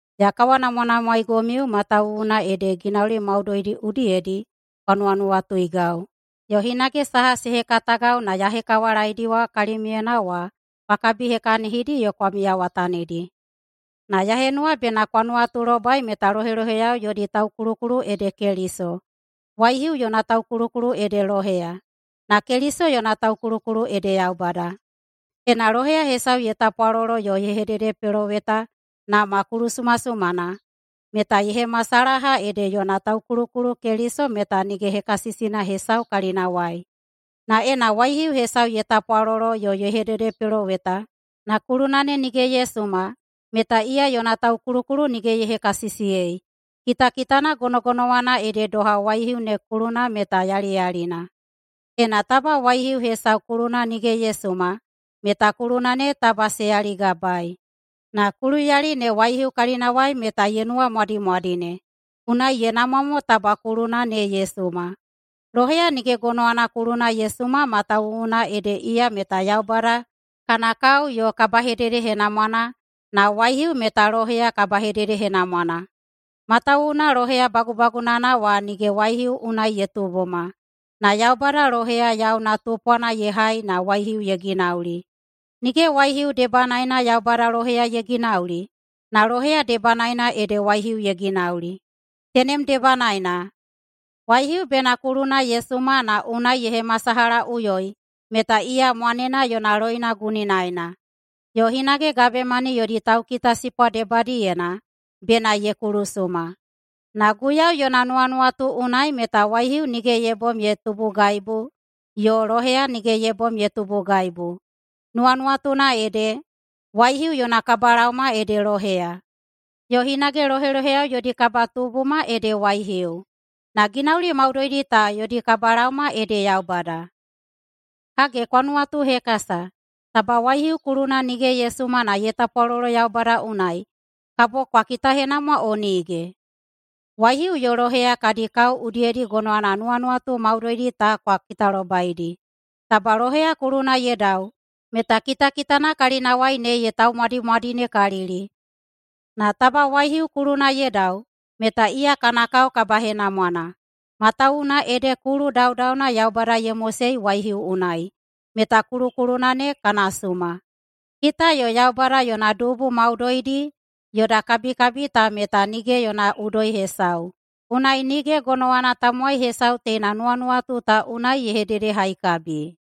Ya kawanamwanamwaegomiu matawuwuna ede ginauli maudoidi udiyedi kwa nuwanuwatuigau, yo hinage saha se hekatagau na ya hekawalaeidiwa kalimiuyena wa kwa kabihekahinidi yo kwa miyawatanidi. Na ya henuwa bena kwa nuwatulobai meta loheloheyao yodi taukulukulu ede Keliso, waihiu yona taukulukulu ede loheya, na Keliso yona taukulukulu ede Yaubada. Ena loheya hesau ye tapwalolo yo ye hededepeloweta na ma kulusumasumana, meta ye hemasalaha ede yona taukulukulu Keliso meta nige hekasisina hesau kalinawai. Na ena waihiu hesau ye tapwalolo yo ye hededepeloweta na kuluna ne nige ye suma meta iya yona taukulukulu nige ye hekasisiyei, kitakitana gonogonowana ede doha waihiu ne kuluna meta yaliyalina. Ena taba waihiu hesau kuluna nige ye suma meta kuluna ne taba se yaligabaei. Na kuluyali ne waihiu kalinawai meta ye nuwamwadimwadine, unai ye namwa mo taba kuluna ne ye suma. Loheya nige gonowana kuluna ye suma matawuwuna ede iya meta Yaubada kana kao yo kabahededehenamwana, na waihiu meta loheya kabahededehenamwana. Matawuwuna loheya bagubagunana wa nige waihiu unai ye tubuma, na Yaubada loheya yauna tupwana ye hai na waihiu ye ginauli. Nige waihiu debanaena Yaubada loheya ye ginauli, na loheya debanaena ede waihiu ye ginauli. Tenem debanaena, waihiu bena kuluna ye suma na unai ye hemasalahaꞌuyoi meta iya mwanena yona loina guninaena. Yo hinage gabemani yodi taukitasipwa debadiyena bena ye kulusuma. Na Guiyau yona nuwanuwatu unai meta waihiu nige ye bom ye tubugaibu yo loheya nige ye bom ye tubugaibu. Nuwanuwatuna ede, waihiu yona kabalaoma ede loheya, yo hinage loheloheyao yodi kabatubuma ede waihiu, na ginauli maudoidi ta yodi kabalaoma ede Yaubada. Hage kwa nuwatuhekasa, taba waihiu kuluna nige ye suma na ye tapwalolo Yaubada unai, kabo kwa kitahenamwa o nige? Waihiu yo loheya kadi kao udiyedi gonowana nuwanuwatu maudoidi ta kwa kitalobaidi. Taba loheya kuluna ye dau meta kitakitana kalinawai ne ye taumwadimwadinekalili. Na taba waihiu kuluna ye dau meta iya kana kao kabahenamwana, matawuwuna ede kulu daudauna Yaubada ye mosei waihiu unai, meta kulukuluna ne kana suma. Kita yo Yaubada yona dubu maudoidi yoda kabikabi ta meta nige yona udoi hesau, unai nige gonowana tamowai hesau teina nuwanuwatu ta unai ye hededehaikabi.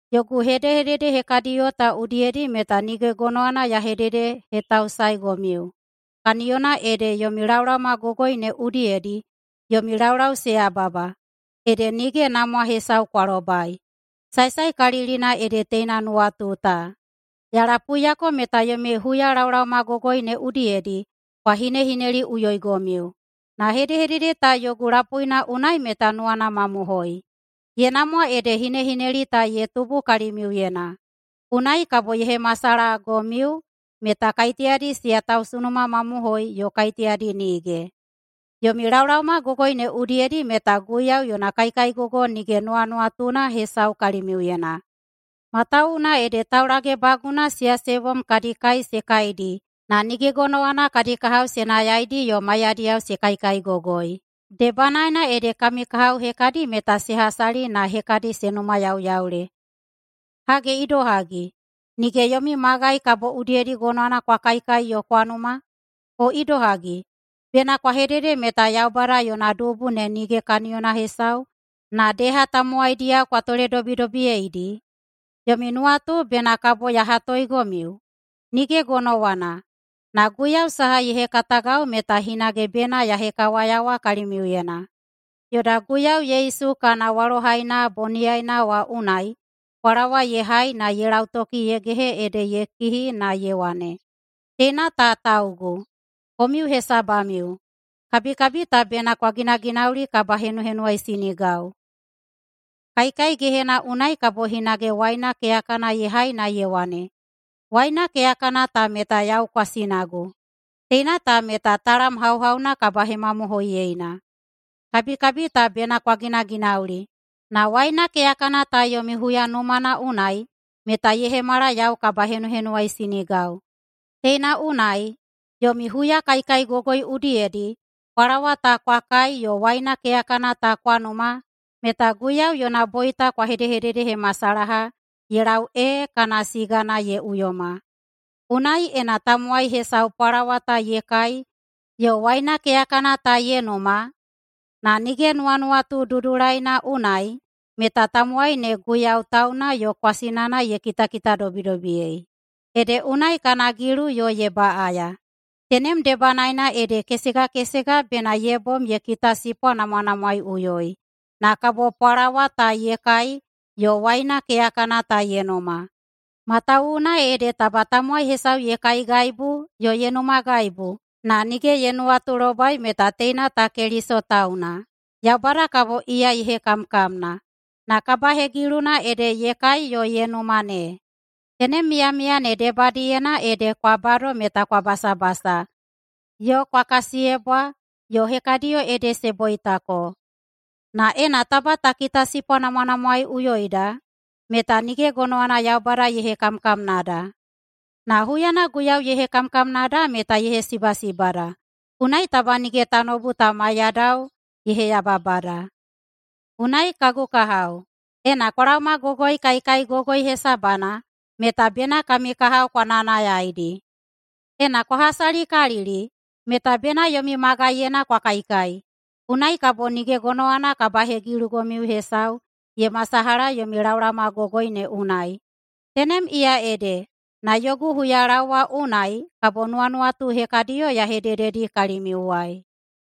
Yogu hedehedede hekadiꞌuyo ta udiyedi meta nige gonowana ya hededehetausaegomiu, kaniyona ede yomi laolaomagogoi ne udiyedi yomi laulau se yababa, ede nige namwa hesau kwa lobai. Saesaekalilina ede teina nuwatu ta: Ya lapuiyako meta yomi huyalaolaomagogoi ne udiyedi kwa hinehineliꞌuyoigomiu. Na hedehedede ta yogu lapuina unai meta nuwana mamohoi. Ye namwa ede hinehineli ta ye tubu kalimiuyena, unai kabo ye hemasalahagomiu meta kaiteyadi siya tausunumamamohoi yo kaiteyadi nige. Yomi laolaomagogoi ne udiyedi meta Guiyau yona kaikaigogo nige nuwanuwatuna hesau kalimiuyena. Matawuwuna ede taulagebaguna siya se bom kadi kai se kaidi na nige gonowana kadi kahao se nayaidi yo maiyadiyao se kaikaigogoi. Debanaena ede kami kahao hekadi meta se hasali na hekadi se numayauyaule. Hage idohagi, nige yomi magai kabo udiyedi gonowana kwa kaikai yo kwa numa? O idohagi, bena kwa hedede meta Yaubada yona dubu ne nige kaniyona hesau, na deha tamowaidiyao kwa toledobidobiyeidi? Yomi nuwatu bena kabo ya hatoegomiu? Nige gonowana! Na Guiyau saha ye hekatagau meta hinage bena ya hekawayawa kalimiuyena. Yoda Guiyau Yesu kana walohaina boniyaina wa unai pwalawa ye hai na ye lautoki ye gehe ede ye kihi na ye wane, “Teina ta taugu, komiu hesabamiu. Kabikabi ta bena kwa ginaginauli kabahenuhenuwaisinigau.” Kaikai gehena unai kabo hinage waina keyakana ye hai na ye wane, “Waina keyakana ta meta yau kwasinagu. Teina ta meta talam hauhauna kabahemamohoiyeina. Kabikabi ta bena kwa ginaginauli, na waina keyakana ta yomi huyanumana unai meta ye hemala yau kabahenuhenuwaisinigau.” Teina unai, yomi huyakaikaigogoi udiyedi pwalawa ta kwa kai yo waina keyakana ta kwa numa meta Guiyau yona boita kwa hedehededehemasalaha ye lau ee kana sigana ye uyoma. Unai, ena tamowai hesau pwalawa ta ye kai yo waina keyakana ta ye numa na nige nuwanuwatu dudulaina unai, meta tamowaina ne Guiyau tauna yo kwasinana ye kitakitadobidobiyei, ede unai kana gilu yo ye baꞌaya. Tenem debanaena ede kesega kesega bena ye bom ye kitasipwanamwanamwaeiꞌuyoi na kabo pwalawa ta ye kai yo waina keyakana ta ye numa. Matawuwuna ede taba tamowai hesau ye kaigaibu yo ye numagaibu na nige ye nuwatulobai meta teina ta Keliso tauna, Yaubada kabo iya ye hekamkamna, na kabahegiluna ede ye kai yo ye numa ne. Tenem miyamiya ne debadiyena ede kwa bado meta kwa basabasa yo kwa kasiyebwa, yo hekadiyo ede se boitako. Na ena taba ta kitasipwanamwanamwaeꞌuyoida meta nige gonowana Yaubada ye hekamkamnada. Na huyana Guiyau ye hekamkamnada meta ye hesibasibada, unai taba nige tanoubu ta maiyadao ye heyababada. Unai, kagu kahao, ena kwa laomagogoi kaikaigogoi hesabana meta bena kami kahao kwa nayanayaidi. Ena kwa hasalikalili meta bena yomi magaiyena kwa kaikai, unai kabo nige gonowana kabahegilugomiu hesau ye masalaha yomi laomagogoi ne unai. Tenem iya ede, na yogu huyalaowa unai kabo nuwanuwatu hekadiyo ya hedededi kalimiuwai.